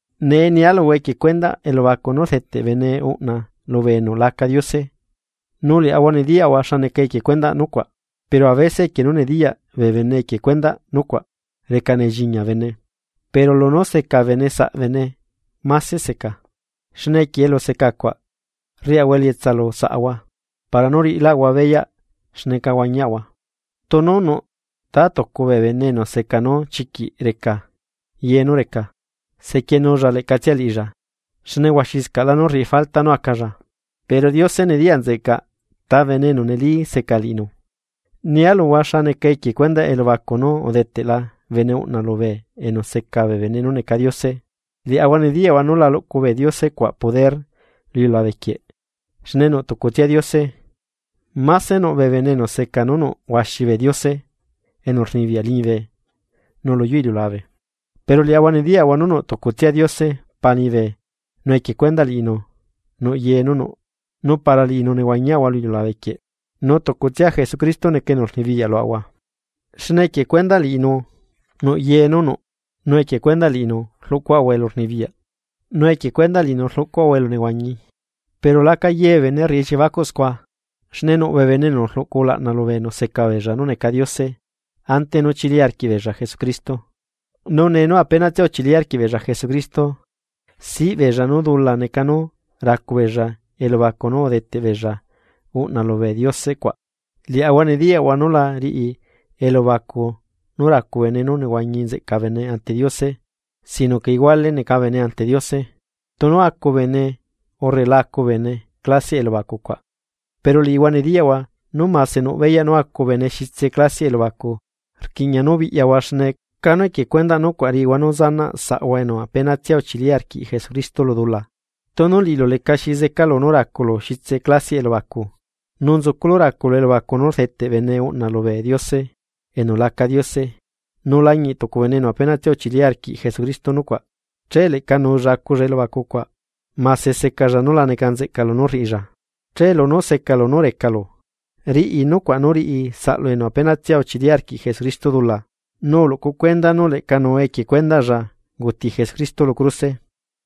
Nee nialuhua equie cuendaꞌ elubacu nú rdeteꞌ bene uꞌna lubee enu laca Diose, nu liaꞌahua nediyaꞌahua xa neca equie cuendaꞌ nucuaꞌ, pero avese equie nú nediyaꞌ bee bene equie cuendaꞌ nucuaꞌ reca nelliñia bene. Pero lunú seca bene saꞌbene máse seca, xne equie elu secacuaꞌ rriaꞌahua elietsa lu saꞌahua para nú riꞌilaꞌahua beyaꞌ xneca huañiaꞌahua. Tunu nuꞌ tatucu bee bene enu seca nú chiquiꞌ reca ye nú reca, sequienulla leꞌcatsia liꞌilla xne huaxiscaꞌlá nú rriꞌi falta nú acalla. Pero Diose nediyaꞌ nzeꞌcaꞌ ta bene enu neli seca liꞌinu. Nia luhua xa neca equie cuendaꞌ elubacu nú udeteꞌla bene uꞌna lubee enu seca bee bene nú neca Diose, liaꞌahua nediyaꞌahua nu la luꞌcu bee diose cuaꞌ poder lu iliulabe quieꞌ, xne nuꞌ tucutsia Diose. Mase nuꞌ bee bene enu seca nú nuꞌ huaxi bee diose enu rnibiyaꞌ liñibe nu luyuu iliulabe, pero liaꞌahua nediyaꞌahua nú nuꞌ tucutsia Diose Pa liñibe nu equie cuendaꞌ liꞌinu nuꞌ ye nú nuꞌ nu para liꞌinu nehuañiaꞌahua lu iliulabe quieꞌ. Nu tucutsia Jesucristo neca enu rnibiyaꞌ luaꞌahua, xne equie cuendaꞌ liꞌinu nuꞌ ye nú nuꞌ nu equie cuendaꞌ liꞌinu rluꞌcuaꞌahua elunehuañi. Pero laca ye bee bene rriꞌi elliebacuꞌ scua. Xne nuꞌ bee bene enu uluꞌcu ulaꞌna lubee enu seca beella nú neca diose ante nú chili arquiꞌbeella Jesucristo, nu nee nú apenatsia uchili arquiꞌ beella Jesucristo siꞌ beella nú dula neca nú racu beella elubacu nú udeteꞌ beella uꞌna lubee diose cuaꞌ. Liaꞌahua nediyaꞌahua nú la riꞌi elubacu nú racu bene nú nehuañi nzeꞌca bene ante Diose, sino que iguale neca bene ante Diose, tunu acu bene urre la acu bene saꞌ clasiaꞌ elubacu cuaꞌ. Pero liꞌihua nediyaꞌhua nú mase nuꞌ beyaꞌ nú acu bene xitse clasiaꞌ elubacu pero rquiꞌña nú biꞌyahua xne canu equie cuendaꞌ nucuaꞌ riꞌihua nú zanaꞌ saꞌhua enu apenatsia uchili arquiꞌ Jesucristo lu dula. Tunu liꞌilu lecaxi zecalu nú raculu xitse clasiaꞌ elubacu, nu nzuculu raculu elubacu nú rdeteꞌ bene uꞌna lubee diose enu laca diose, nu lañiꞌ tucu bene enu apenatsia uchili arquiꞌ Jesucristo nucuaꞌ, che leꞌca nuulla aculla elubacucuaꞌ, mase secalla núla neca nzeꞌca lunú rriꞌilla. Che lunú secalu nú recalu, riꞌi nucuaꞌ nú riꞌi saꞌlu enu apenatsia uchili arquiꞌ Jesucristo dula, nu uluꞌcu cuenda nú leꞌca nuu equie cuendaꞌlla unguti Jesucristo lu cruse.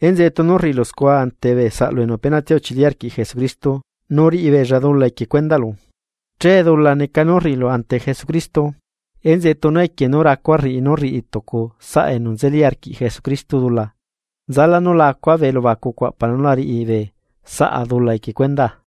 Enzeꞌe tunu rriꞌilu scua ante bee saꞌlu enu apenatsia uchili arquiꞌ Jesucristo, nu riꞌibeella dula equie cuendaꞌlu, che dula neca nú rriꞌilu ante Jesucristo. Enzeꞌe tunu equie nú racua rriꞌi nú rriꞌi tucu saꞌa enu nzeli arquiꞌ Jesucristo dula, nzalá nú la acuaꞌa bee elubacucua para nú la riꞌi bee saꞌa dula equie cuendaa.